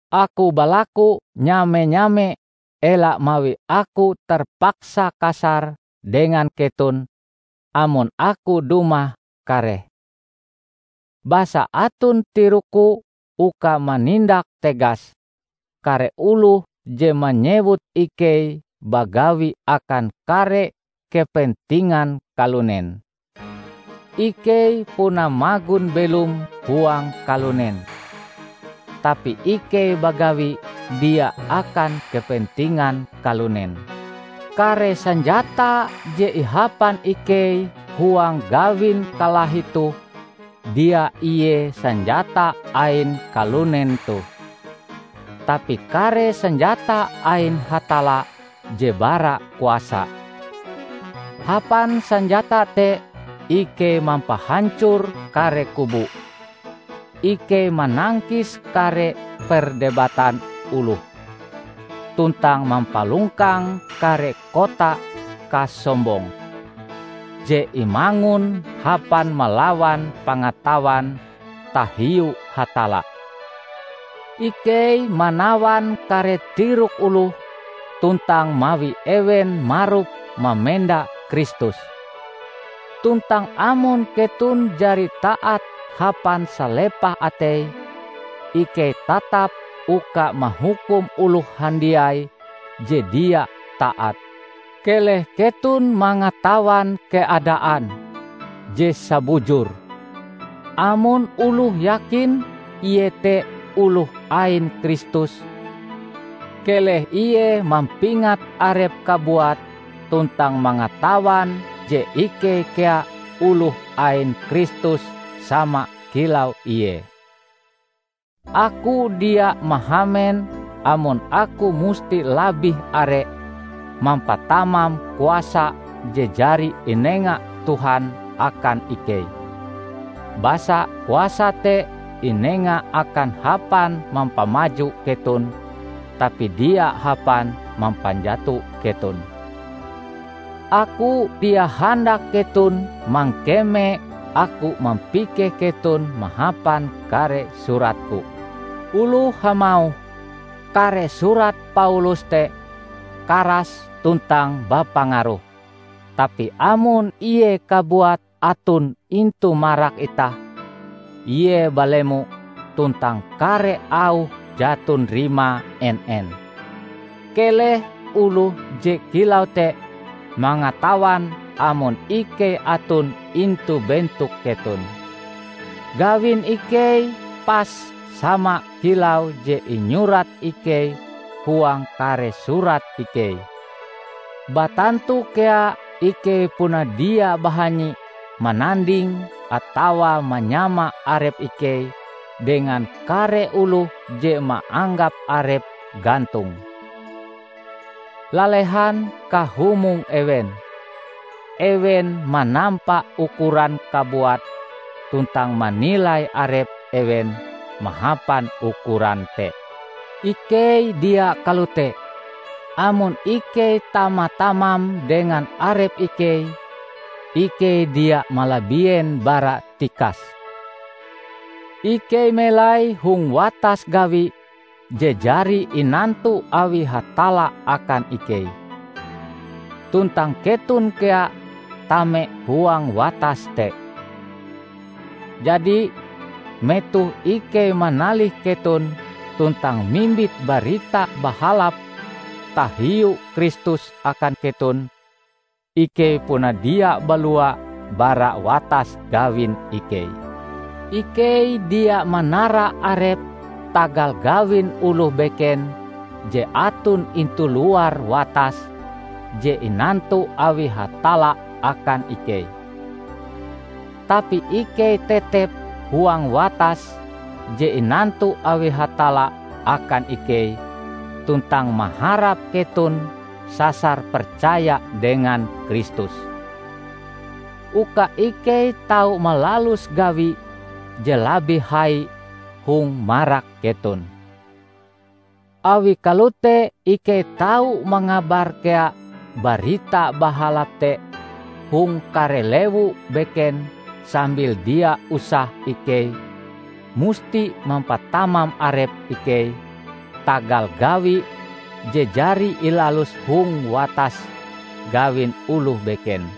aku balaku nyame-nyame ela mawi aku terpaksa kasar dengan keton amon aku dumah kareh. Basa aton tirokku uka manindak tegas kare oloh je manyewut ikei bagawi akan kare kepentingan kalunen. Ikei puna magon belom huang kalunen, tapi ikei bagawi dia akan kepentingan kalunen. Kare sanjata je ihapan ikei huang gawin kalahi toh dia ie sanjata ain kalunen toh, tapi kare sanjata ain Hatalla je bara kuasa. Hapan sanjata te ikei mampahancor kare kubu; ikei manangkis kare perdebatan oloh tuntang mampalongkang kare kota kasombong je imangun hapan malawan pangatawan tahiu Hatalla. Ikei manawan kare tirok oloh tuntang mawi ewen marup mamenda Kristus. Tuntang amon keton jari taat hapan salepah atei, ikei tatap uka mahukum oloh handiai je dia taat. Keleh keton mangatawan keadaan je sabujure. Amon oloh yakin ie te oloh ain Kristus, keleh ie mampingat arepe kabuat tuntang mangatawan je ikei kea oloh ain Kristus sama kilau ie. Aku dia mahamen amon aku musti labih are mampatamam kuasa je jari inenga Tuhan akan ikei, basa kuasa te inenga akan hapan mampamaju keton tapi dia hapan mampanjato keton. Aku dia handak keton mangkeme aku mampikeh keton mahapan kare suratku. Oloh hamauh, "Kare surat Paulus te karas tuntang bapangaruh, tapi amon ie kabuat aton intu marak itah, ie balemo tuntang kare auhe jaton rimae en-en!" Keleh oloh je kilau te mangatawan amon ikei aton intu bentok keton, gawin ikei pas sama kilau je inyurat ikei huang kare surat ikei. Batantu kea ikei puna dia bahanyi mananding atawa manyama arep ikei dengan kare oloh je maanggap arepe gantong. Lalehan kahumong ewen! Ewen manampa ukuran kabuat tuntang manilai arep ewen mahapan ukuran te. Ikei dia kalote. Amon ikei tama-tamam dengan arep ikei, ikei dia malabien bara tikase. Ikei melai hong watas gawi je jari inantu awi Hatalla akan ikei. Tuntang keton kea tame huang watas te. Jadi, metoh ikei manalih keton tuntang mimbit Barita Bahalap tahiu Kristus akan keton, ikei puna dia balua bara watas gawin ikei. Ikei dia manara arep tagal gawin oloh beken je aton intu luar watas je inantu awi Hatalla akan ikei. Tapi ikei tetep huang watas je inantu awi Hatalla akan ikei tuntang maharap keton sasar percaya dengan Kristus, uka ikei tau malalus gawi je labih hai hong marak keton. Awi kalote ikei tau mangabar kea Barita Bahalap te hong kare lewu beken sambil dia usah ikei musti mampatamam arep ikei tagal gawi je jari ilalus hong watas gawin oloh beken.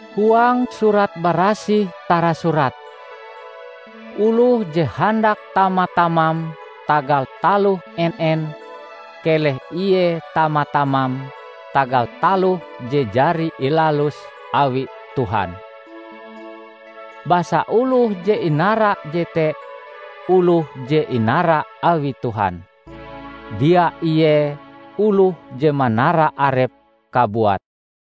Huang Surat Barasih tarasurat, "Oloh je handak tama-tamam tagal taloh en-en, keleh ie tama-tamam tagal taloh je jari ilalus awi Tuhan." Basa oloh je inara jete oloh je inara awi Tuhan, dia ie oloh je manara arepe kabuat.